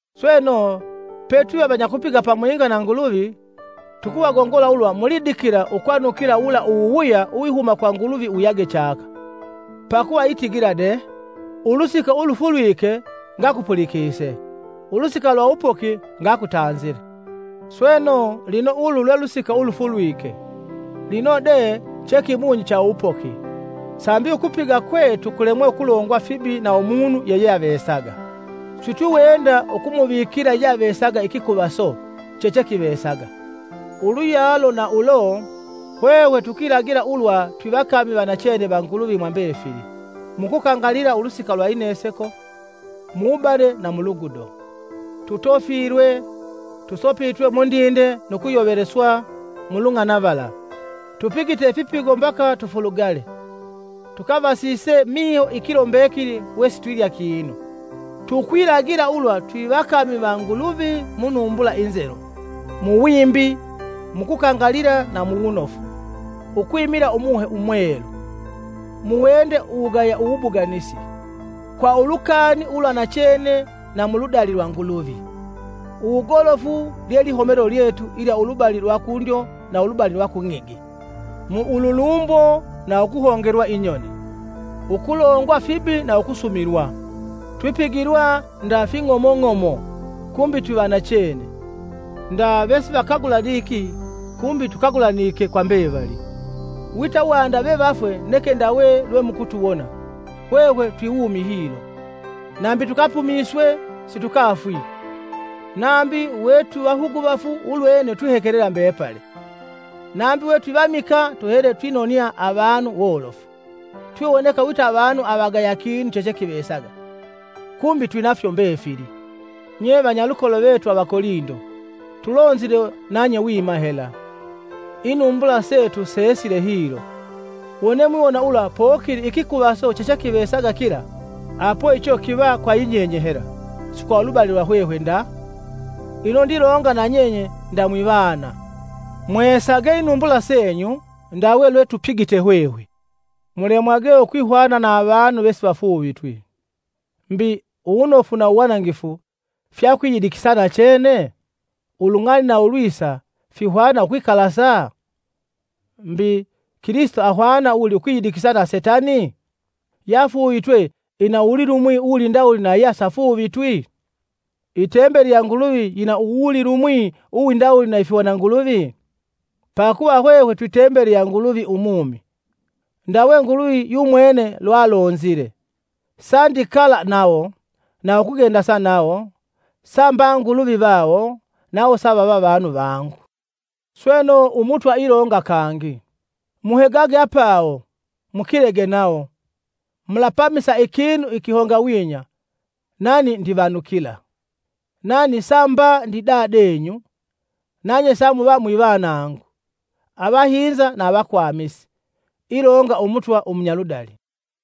Sweno, petwiva vanyakupiga pamwinga na Nguluvi, tukuvagongola ulwa mulidikila ukwanukila wula uwuwuya uwihuma kwa Nguluvi wuyage chaka. Pakuva itigila de, “Ulusika ulufulwike, ngakupulikise, ulusika lwa uwupoki ngakutanzile.” Sweno lino ulu lwe lusika ulufulwike, lino de che kimunyi cha uwupoki! Sambi ukupiga kwetu kulemwe ukulongwa fibi na umunu yeyeavesaga, sitwiwenda ukumuvikila yeyeavesaga ikikuvaso chechekivesaga. Uluyalo na ulo, hwehwe tukwilagila ulwa twivakami va nachene va Nguluvi mwa mbefili; mu kukangalila ulusika lwa ineseko, mu wubane na mu ludugo. Tutofilwe, tusopitwe mundinde nu kuyoveleswa mu lung'anavala; tupigite ifipigo mbaka tufulugale, tukavasise miho ikilo mbekili we sitwilya kinu. Tukwilagila ulwa twivakami va Nguluvi mu munumbula inzelu, muwimbi, mu kukangalila na mu wunofu; ukwimila Umuhe Umwelu, mu wende uwugaya uwubuganisi, kwa ulukani ulwa nachene na muludali lwa Nguluvi. Uwugolofu lye lihomelo lyetu ilya ulubali lwa kundyo na ulubali lwa kung'igi. Mu ululumbo na ukuhongelwa inyoni, ukulongwa fibi na ukusumilwa. Twipigilwa nda fing'omong'omo, kumbi twivanachene, Nda vesivakagulaniki, kumbi tukagulanike kwa mbevali; wita wanda vevafwe neke ndawe lwemukutuwona, hwehwe twiwumi hilo. Nambi tukapumiswe, situkafwi; nambi wetwivahuguvafu ulwene twihekelela mbepali; nambi we twivamikaa tuhele twinoniya avanu wolofu; twiwoneka wita avanu avagaya kinu chechekivesaga, kumbi twinafyo mbefili. Nye vanyalukolo vetu Avakolindo, tulonzile nanye wima hela, inumbula setu seesile hilo. Wone mwiwona ulwa pokili ikikuvaso chechekivesaga kila, apo icho kiva kwa yinyenye hela, si kwa ulubali lwa hwehwe nda. Lino ndilonga nanyenye nda mwivana, mweesage inumbula senyu ndawe lwe tupigite hwehwe. Mulemwage ukwihwana na avanu vesivafuuvitwi. Mbi, uwunofu na uwanangifu fyakwiyidikisa nachene? Ulung'ali na ulwisa fihwana ukwikalasa? Mbi, Kilisito ahwana wuli ukwiyidikisa na setani? Yafuuvitwe ina uwulilumwi uwindawuli na yesafuuvitwi? Itembeli ya Nguluvi yina uwulilumwi uwindawuli na ifihwananguluvi? Pakuva hwehwe twi tembeli ya Nguluvi umumi. Ndawe Nguluvi yumwene lwalonzile: “Sandikala nawo, na ukugendasa nawo, samba Nguluvi vawo, nawo savava vanu vangu.” Sweno Umutwa ilonga kangi, “Muhegage apawo, mukilege nawo, mulapamisa ikinu ikihongawinya, nani ndivanukila. Nani samba ndi Dadenyu, nanye samuva mwivanangu, avahinza na avakwamisi. Ilonga Umutwa Umunyaludali.”